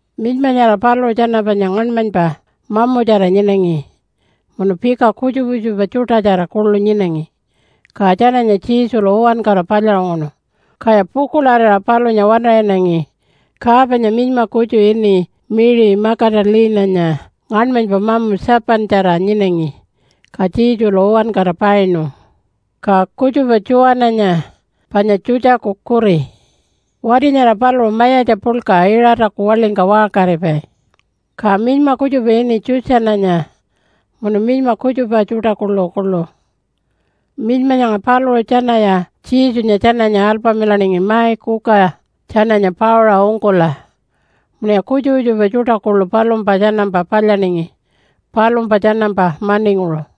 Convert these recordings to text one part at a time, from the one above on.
Minyma nyara paluṟu tjana panya ngaṉmanypa mamutjara nyinangi munu pika kutjupa kutjupa tjuṯatjara kuḻu nyinangi. Ka tjananya Jesulu uwankara palyaṟunguṉu, kaya pukuḻarira palunya waṉaṟinangi. Ka panya minyma kutju ini Mary Magdalene-anya ngaṉmanypa mamu 7-tjara nyinangi, ka Jesulu uwankara painu. Ka kutjupa Tjuwananya panya Tjutjaku kuri. Wati nyara paluṟu mayatja puḻka Iṟataku waḻingka waṟkaripai. Ka minyma kutjupa ini Tjutjananya munu minyma kutjupa tjuṯa kuḻukuḻu. Minyma nyanga paluṟu tjanaya Jesunya tjananya alpamilaningi mai kuka tjananya pauṟa ungkula munuya kutjupa kutjupa tjuṯa kuḻu palumpa tjanampa palyaningi palumpa tjanampa maninguṟu.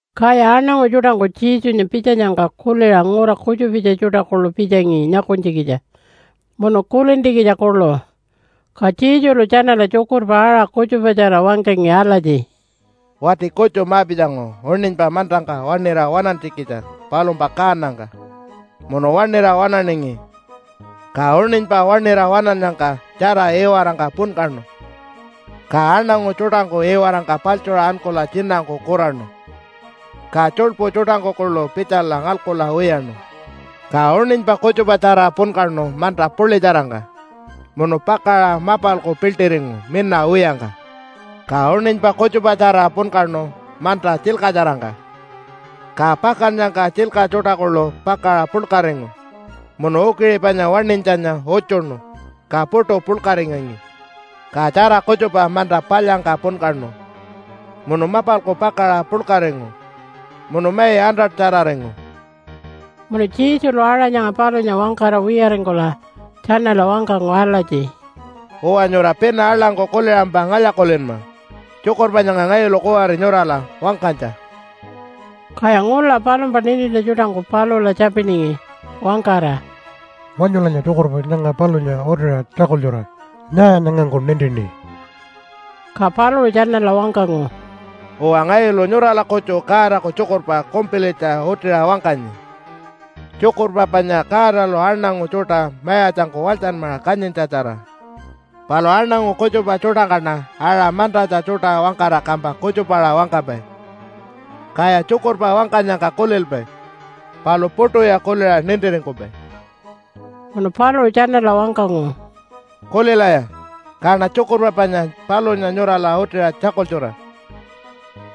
Kaya aṉangu tjuṯangku Jesunya pitjanyangka kuliṟa ngura kutjupitja tjuṯa kuḻu pitjangi nyakunytjikitja munu kulintjikitja kuḻu. Ka Jesulu tjanala tjukurpa aṟa kutjupatjara wangkangi alatji, “Wati kutju ma-pitjangu uṉinypa mantangka waṉira waṉantjikitja palumpa kaanangka munu waṉira waṉaningi. Ka uṉinypa waṉira waṉinyangka tjara iwarangka punkaṉu. Ka aṉangu tjuṯangku iwarangka paḻtjuṟa ankula tjinangku kuraṉu, ka tjuḻpu tjuṯangku kuḻu pitjala ngalkula wiyaṉu. Ka uṉinypa kutjupatjara punkaṉu manta puḻitjarangka, munu pakaṟa mapalku piḻṯiringu mina wiyangka. Ka uṉinypa kutjupatjara punkaṉu manta tjilkatjarangka, ka pakannyangka tjilka tjuṯa kuḻu pakaṟa puḻkaringu munu ukiṟi panya waṉinytjanya utjuṉu, ka puṯu puḻkaringangi. Ka tjara kutjupa manta palyangka punkaṉu munu mapalku pakaṟa puḻkaringu munu mai 100-tjararingu.” Munu Jesulu aṟa nyanga palunya wangkara wiyaringkula tjanala wangkangu alatji, “Uwa, nyura pina aḻangku kuliṟampa ngalya-kulinma tjukurpa nyanga ngayulu kuwari nyurala wangkanytja.” Kaya ngula palumpa nintintja tjuṯangku palula tjapiningi wangkara, “Wanyulanya tjukurpa nyanga palunya utiṟa tjakultjura. Nyaa nyangangku nintini?” Ka paluṟu tjanala wangkangu, “Uwa, ngayulu nyurala kutju Godaku tjukurpa kumpilitja utiṟa wangkanyi, tjukurpa panya Godalu aṉangu tjuṯa mayatjangku walytjanmaṟa kanyintjatjara. Palu aṉangu kutjupa tjuṯangkaṉa aṟa mantatja tjuṯa wangkara kampa kutjupaṟa wangkapai, kaya tjukurpa wangkanyangka kulilpai palu puṯuya kuliṟa nintiringkupai.” Munu paluṟu tjanala wangkangu, “Kulilaya, kaṉa tjukurpa panya palunya nyurala utiṟa tjakultjura!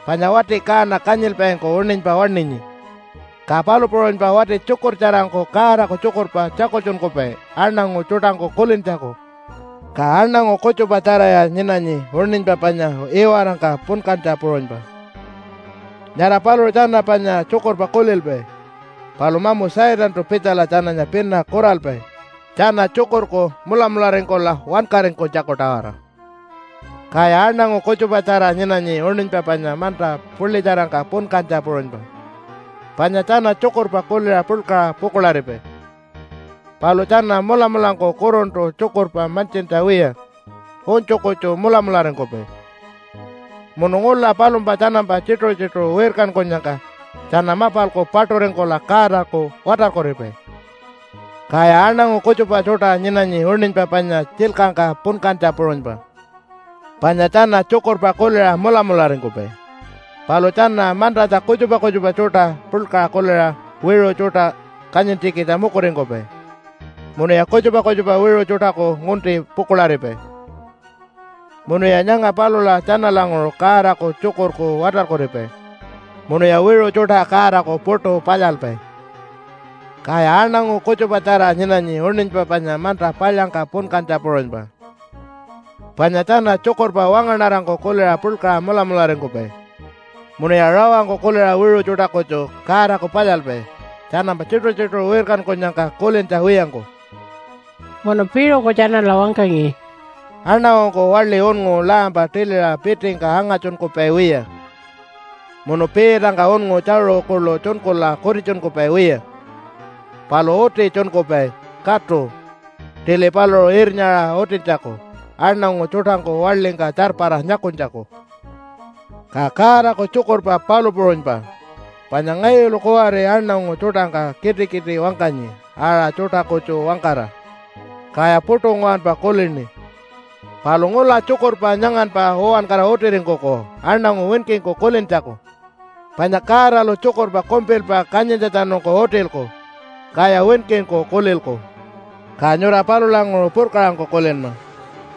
Panya wati kaana kanyilpaingku uṉinypa waṉinyi, ka palu puṟunypa wati tjukurtjarangku Godaku tjukurpa tjakultjunkupai aṉangu tjuṯangku kulintjaku. Ka aṉangu kutjupa tjaraya nyinanyi uṉinypa panya iwarangka punkantja puṟunypa. Nyara paluṟu tjana panya tjukurpa kulilpai, palu mamu Satantu pitjala tjananya pina kuralpai tjana tjukurku mulamularingkula wankaringkunytjaku-tawara. “Kaya aṉangu kutjupatjara nyinanyi uṉinypa panya manta puḻitjarangka punkantja puṟunypa. Panya tjana tjukurpa kuliṟa puḻkaṟa pukuḻaripai, palu tjana mulamulangku kuruntu tjukurpa mantjintja wiya unytju kutju mulamularingkupai. Munu ngula palumpa tjanampa tjituṟu-tjituṟu wirkankunyangka tjana mapalku paṯuringkula Godaku watarkuripai. “Kaya aṉangu kutjupa tjuṯa nyinanyi uṉinypa panya tjilkangka punkantja puṟunypa, panya tjana tjukurpa kuliṟa mulamularingkupai, palu tjana mantatja kutjupa kutjupa tjuṯa puḻkaṟa kuliṟa, wiṟu tjuṯa kanyintjikitja mukuringkupai munuya kutjupa kutjupa wiṟu tjuṯaku ngunti pukuḻaripai. Munuya nyanga palula tjanalanguṟu Godaku tjukurku watarkuripai munuya wiṟu tjuṯa Godaku puṯu palyalpai. “Kaya aṉangu kutjupatjara nyinanyi uṉinypa panya manta palyangka punkantja puṟunypa, panya tjana tjukurpa wangaṉarangku kuliṟa puḻkaṟa mulamularingkupai. Munuya rawangku kuliṟa wiṟu tjuṯa kutju Godaku palyalpai, tjanampa tjituṟu-tjituṟu wirkankunyangka kulintja wiyangku.” Munu piṟuku tjanala wangkangi, “Aṉangungku waḻi unngu lampa tiliṟa pitingka anga-tjunkupai wiya, munu piitangka unngu tjaṟu kuḻu tjunkula kutitjunkupai wiya. Palu uti tjunkupai, katu, tili paluṟu irnyaṟa utintjaku aṉangu tjuṯangku waḻingka tjarpara nyakunytjaku. “Ka Godaku tjukurpa palu puṟunypa, panya ngayulu kuwari aṉangu tjuṯangka kitikiti wangkanyi aṟa tjuṯa kutju wangkara, kaya puṯu nguwanpa kulini. Palu ngula tjukurpa nyanganpa uwankara utiringkuku aṉangu winkingku kulintjaku. Panya Godalu tjukurpa kumpilpa kanyintjatjanungku utilku, kaya winkingku kulilku. Ka nyura palulanguṟu purkaṟangku kulinma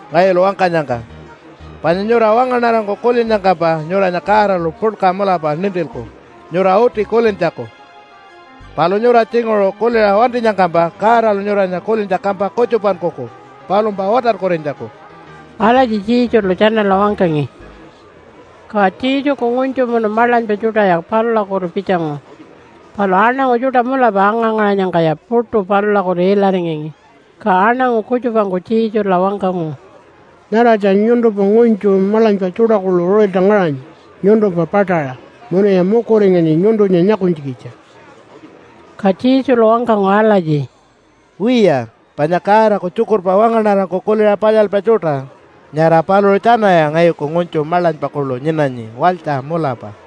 ngayulu wangkanyangka. Panya nyura wangaṉarangku kulinnyangkampa nyuranya Godalu puḻka mulapa nintilku nyura uti kulintjaku. Palu nyura tjinguṟu kuliṟa wantinyangkampa Godalu nyuranya kulintja kampa kutjupankuku palumpa watarkurinytjaku.” Alatji Jesulu tjanala wangkangi. Ka Jesuku ngunytju munu maḻanypa tjuṯaya palulakutu pitjangu, palu aṉangu tjuṯa mulapa anga-ngaṟanyangkaya puṯu palulakutu ilaringangi. Ka aṉangu kutjupangku Jesula wangkangu, “Nyaratja nyuntumpa ngunytju maḻanypa tjuṯa kuḻu uṟilta ngaṟanyi nyuntumpa paṯaṟa munuya mukuringanyi nyuntunya nyakunytjikitja.” Ka Jesulu wangkangu alatji, “Wiya, panya Godaku tjukurpa wangaṉarangku kuliṟa palyalpai tjuṯa, nyara paluṟu tjanaya ngayuku ngunytju maḻanypa kuḻu nyinanyi walytja mulapa.”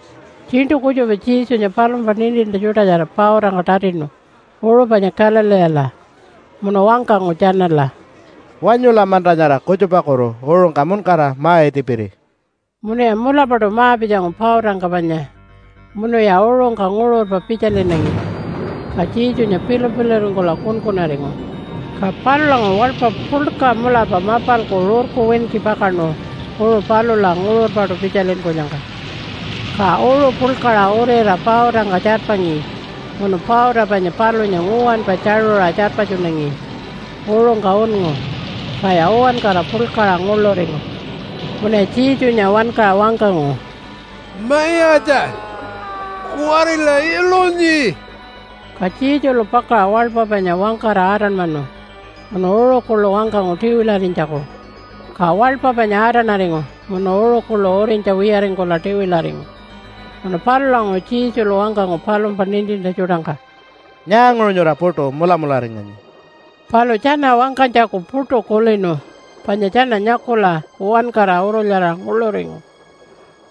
Tjiṉṯu kutjupa Jesunya palumpa nintintja tjuṯatjara pautangka tatinu uṟu panya Galileela munu wangkangu tjanala, “Wanyula manta nyara kutjupakutu uṟungka muṉkara ma-itipiri.” Munuya mulapaṯu ma-pitjangu pautangka panya munuya uṟungka nguṟurpa pitjalinangi. Ka Jesunya pilu-piluringkula kunkunaringu. Ka palulanguṟu waḻpa puḻka mulapa mapalku rurku winki pakaṉu uṟu palula nguṟurpaṯu pitjalinkunyangka. Ka uṟu puḻkaṟa uriṟa pautangka tjarpangi munu pauta panya palunya nguwanpa tjaṟuṟa tjarpatjunangi uṟungka unngu. Kaya uwankara puḻkaṟa nguḻuringu. Munuya Jesunya wankaṟa wangkangu, “Mayatja, kuwarila ilunyi!” Ka Jesulu pakaṟa waḻpa panya wangkara atanmanu munu uṟu kuḻu wangkangu tiwilarinytjaku, ka waḻpa panya atanaringu munu uṟu kuḻu urinytja wiyaringkula tiwilaringu. Munu palulanguṟu Jesulu wangkangu palumpa nintintja tjuṯangka, “Nyaanguṟu nyura puṯu mulamularinganyi?” Palu tjana wangkanytjaku puṯu kulinu panya tjana nyakula uwankara urulyaraṟa nguḻuringu.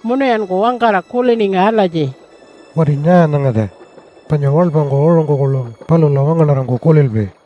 Munuyanku wangkara kuliningi alatji, “Wati nyaa nyangatja? Panya waḻpangku uṟungku kuḻu palula wangaṉarangku kulilpai.”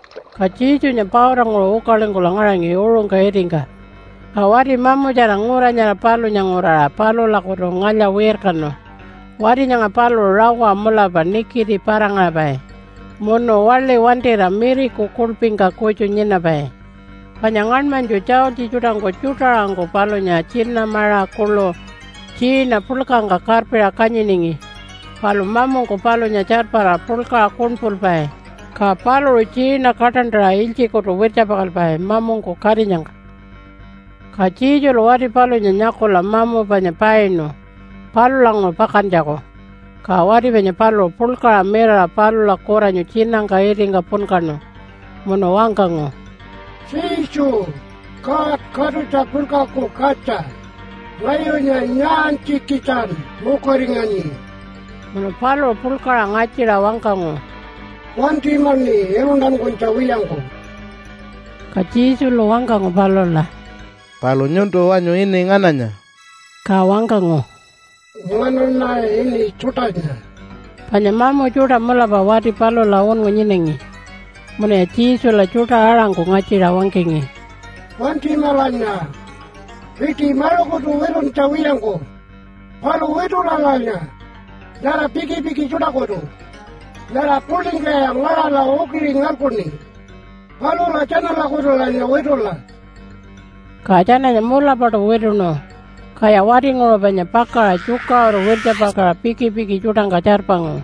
Ka Jesunya pautanguṟu ukalingkula ngaṟangi uṟungka itingka, ka wati mamutjara ngura nyara palunya nguraṟa palulakutu ngalya-wirkanu. Wati nyanga paluṟu rawa mulapa nikiti para-ngaṟapai munu waḻi wantira miriku kuḻpingka kutju nyinapai. Panya ngaṉmanytju tjaultji tjuṯangku tjuṯa-aṟangku palunya tjina maṟa kuḻu tjiina puḻkangka karpiṟa kanyiningi, palu mamungku palunya tjarpara puḻkaṟa kuṉpulpai, ka paluṟu tjiina kaṯantaṟa ilytjikutu wirtjapakalpai mamungku katinyangka. Ka Jesulu wati palunya nyakula mamu panya painu palulanguṟu pakantjaku. Ka wati panya paluṟu puḻkaṟa mirara palula kuranyu tjinangka itingka punkaṉu munu wangkangu, “Jesu, God Katutja Puḻkaku Katja! Ngayunya nyaantjikitjan mukuringanyi?” Munu paluṟu puḻkaṟa ngatjiṟa wangkangu, “Wantimaṉi iluntankunytja wiyangku!” Ka Jesulu wangkangu palula, “Palu nyuntu wanyu ini ngananya?” Ka wangkangu, “Nganaṉa ini ‘Tjuṯanya.’” Panya mamu tjuṯa mulapa wati palula unngu nyinangi. Munuya Jesula tjuṯa-aṟangku ngatjiṟa wangkangi, “Wantimalanya piṯi maṟukutu wituntja wiyangku. Palu witulalanya nyara pikipiki tjuṯakutu, nyara puḻingkaya ngaṟala ukiṟi ngalkuṉi, palula tjanalakutulanya witula.” Ka tjananya mulapaṯu wituṉu, kaya watinguṟu panya pakaṟa tjukaṟuru wirtjapakaṟa pikipiki tjuṯangka tjarpangu.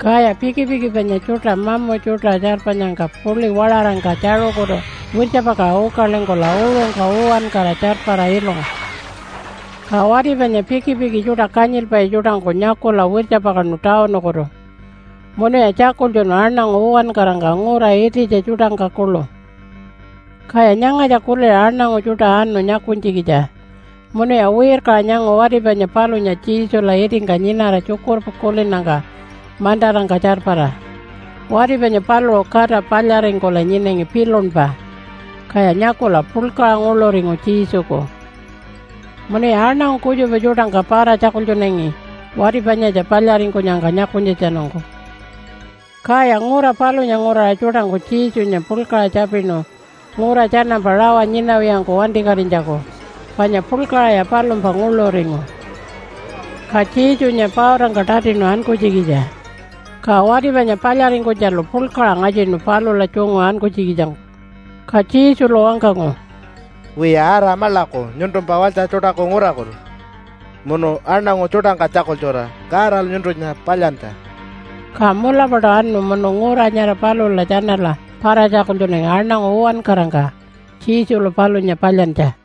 Kaya pikipiki panya tjuṯa mamu tjuṯa tjarpanyangka puḻi waṟarangka tjaṟukutu wirtjapakaṟa ukalingkula uṟungka uwankara tjarpara ilungu. Ka wati panya pikipiki tjuṯa kanyilpai tjuṯangku nyakula wirtjapakaṉu tawunukutu, munuya tjakultjunu aṉangu uwankarangka ngura ititja tjuṯangka kuḻu. Kaya nyangatja kuliṟa aṉangu tjuṯa anu nyakunytjikitja munuya wirkaṟa nyangu wati panya palunya Jesula itingka nyinara tjukurpa kulinnyangka mantarangka tjarpara. Wati panya paluṟu kata palyaringkula nyinangi pilunpa, kaya nyakula puḻkaṟa nguḻuringu Jesuku. Munuya aṉangu kutjupa tjuṯangka para-tjakultjunangi wati panyatja palyaringkunyangka nyakunytjatjanungku. Kaya ngura palunya nguraṟa tjuṯangku Jesunya puḻkaṟa tjapinu ngura tjanampa rawa nyinawiyangku wantikatinytjaku panya puḻkaṟaya palumpa nguḻuringu. Ka Jesunya pautangka tatinu ankunytjikitja. Ka wati panya palyaringkunytjalu puḻkaṟa ngatjinu palula tjungu ankunytjikitjangku. Ka Jesulu wangkangu, “Wiya, ara maḻaku nyuntumpa walytja tjuṯaku ngurakutu munu aṉangu tjuṯangka tjakultjura Godalu nyuntunya palyantja.” Ka mulapaṯu anu munu ngura nyara palula tjanala para-tjakultjunangi aṉangu uwankarangka Jesulu palunya palyantja.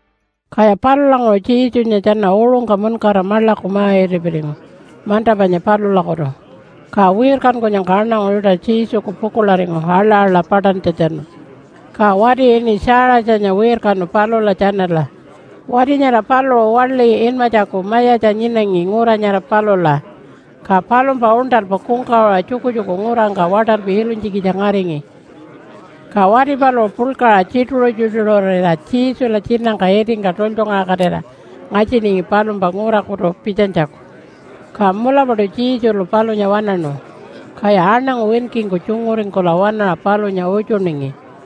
Kaya palulanguṟu Jesunya tjana uṟungka muṉkara maḻaku ma-itipiringu manta panya palulakutu. Ka wirkankunyangka aṉangu tjuṯa Jesuku pukuḻaringu aḻa-aḻa paṯantjatjanu. Ka wati ini Tjaiṟatjanya wirkanu palula tjanala. Wati nyara paluṟu waḻi inmatjaku mayatja nyinangi ngura nyara palula, ka palumpa uṉṯalpa kungkawaṟa tjukutjuku ngurangka waṯalpi ilunytjikitja ngaringi. Ka wati paluṟu puḻkaṟa tjituṟu-tjituṟurira Jesula tjinangka itingka tultjungaṟakatira ngatjiningi palumpa ngurakutu pitjanytjaku. Ka mulapaṯu Jesulu palunya waṉaṉu. Kaya aṉangu winkingku tjunguringkula waṉaṟa palunya utjuningi.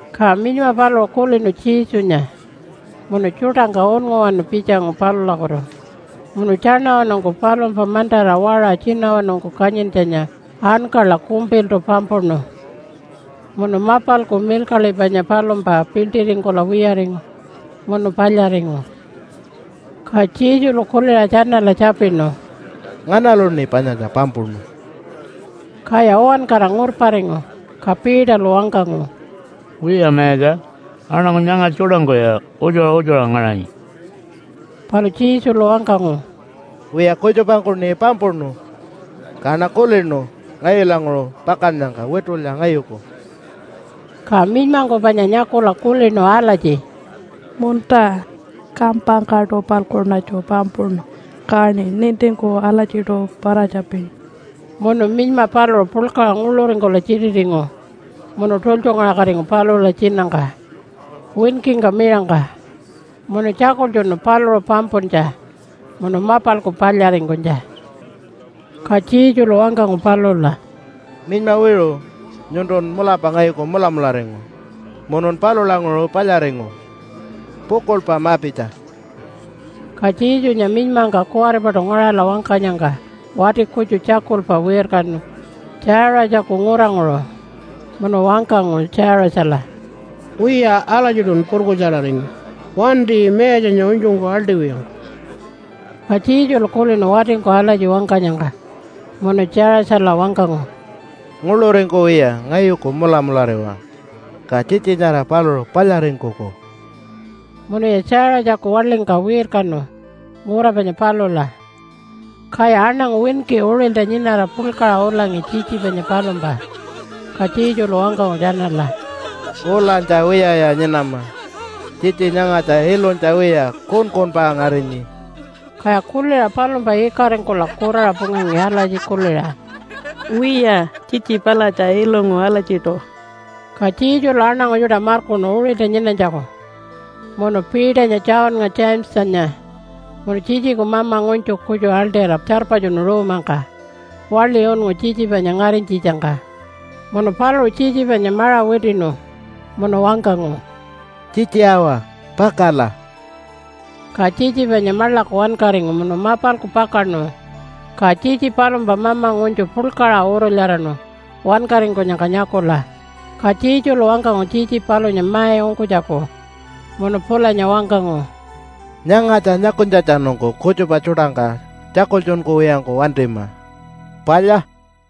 Ka minyma paluṟu kulinu Jesunya munu tjuṯangka unnguwanu pitjangu palulakutu, munu tjaṉawanungku palumpa mantara waṟa tjinawanungku kanyintjanya ankala kumpiltu pampuṉu. Munu mapalku milkaḻi panya palumpa piḻṯiringkula wiyaringu munu palyaringu. Ka Jesulu kuliṟa tjanala tjapinu, “Nganaluṉi panyatja pampuṉu?” Kaya uwankara ngurparingu. Ka Peterlu wangkangu, “Wiya Mayatja, aṉangu nyanga tjuṯangkuya utjuṟa utjuṟa ngaṟanyi.” Palu Jesulu wangkangu, “Wiya, kutjupangkuṉi pampuṉu, kaṉa kulinu ngayulanguṟu pakannyangka witulya ngayuku.” Ka minymangku panya nyakula kulinu alatji, “Munta, kampangkaṯu-palkuṉatju pampuṉu kaṉi nintingku alatjiṯu para-tjapini.” Munu minyma paluṟu puḻkaṟa nguḻuringkula tjititingu munu tultjungaṟakatingu palula tjinangka winkingka miṟangka munu tjakultjunu paluṟu pampuntja munu mapalku palyaringkunytja. Ka Jesulu wangkangu palula, “Minyma wiṟu, nyuntun mulapa ngayuku mulamularingu, munun palulanguṟu palyaringu. Pukuḻpa ma-pitja.” Ka Jesunya minymangka kuwaripaṯu ngaṟala wangkanyangka wati kutju tjakulpa wirkanu Tjaiṟatjaku nguranguṟu munu wangkangu Tjaiṟatjala, “Wiya, alatjiṯun purkutjararingu. Wanti Mayatjanya unytjungku aḻṯiwiyangku.” Ka Jesulu kulinu watingku alatji wangkanyangka munu Tjaiṟatjala wangkangu, “Nguḻuringkuwiya ngayuku mulamulariwa, ka tjitji nyara paluṟu palyaringkuku.” Munuya Tjaiṟatjaku waḻingka wirkanu ngura panya palula. Kaya aṉangu winki uṟilta nyinara puḻkaṟa ulangi tjitji panya palumpa. Ka Jesulu wangkangu tjanala, “Ulanytja wiyaya nyinama. Tjitji nyangatja ilunytja wiya, kunkunpa ngarinyi.” Kaya kuliṟa palumpa ikaringkula kuraṟa pungangi alatji kuliṟa, “Wiya tjitji palatja ilungu alatjiṯu.” Ka Jesulu aṉangu tjuṯa markuṉu uṟilta nyinanytjaku munu Peternya, Johnnga, Jamesanya munu tjitjiku mama ngunytju kutju aḻṯira tjarpatjunu ruumangka waḻi unngu tjitji panya ngarinytjitjangka. Munu paluṟu tjitji panya maṟa witiṉu, munu wangkangu, “Tjitji awa, pakala!” Ka tjitji panya maḻaku wankaringu munu mapalku pakaṉu. Ka tjitji palumpa mama ngunytju puḻkaṟa urulyaraṉu wankaringkunyangka nyakula. Ka Jesulu wangkangu tjitji palunya mai ungkunytjaku, munu pulanya wangkangu, “Nyangatja nyakunytjatjanungku kutjupa tjuṯangka tjakultjunkuwiyangku wantima. Palya?”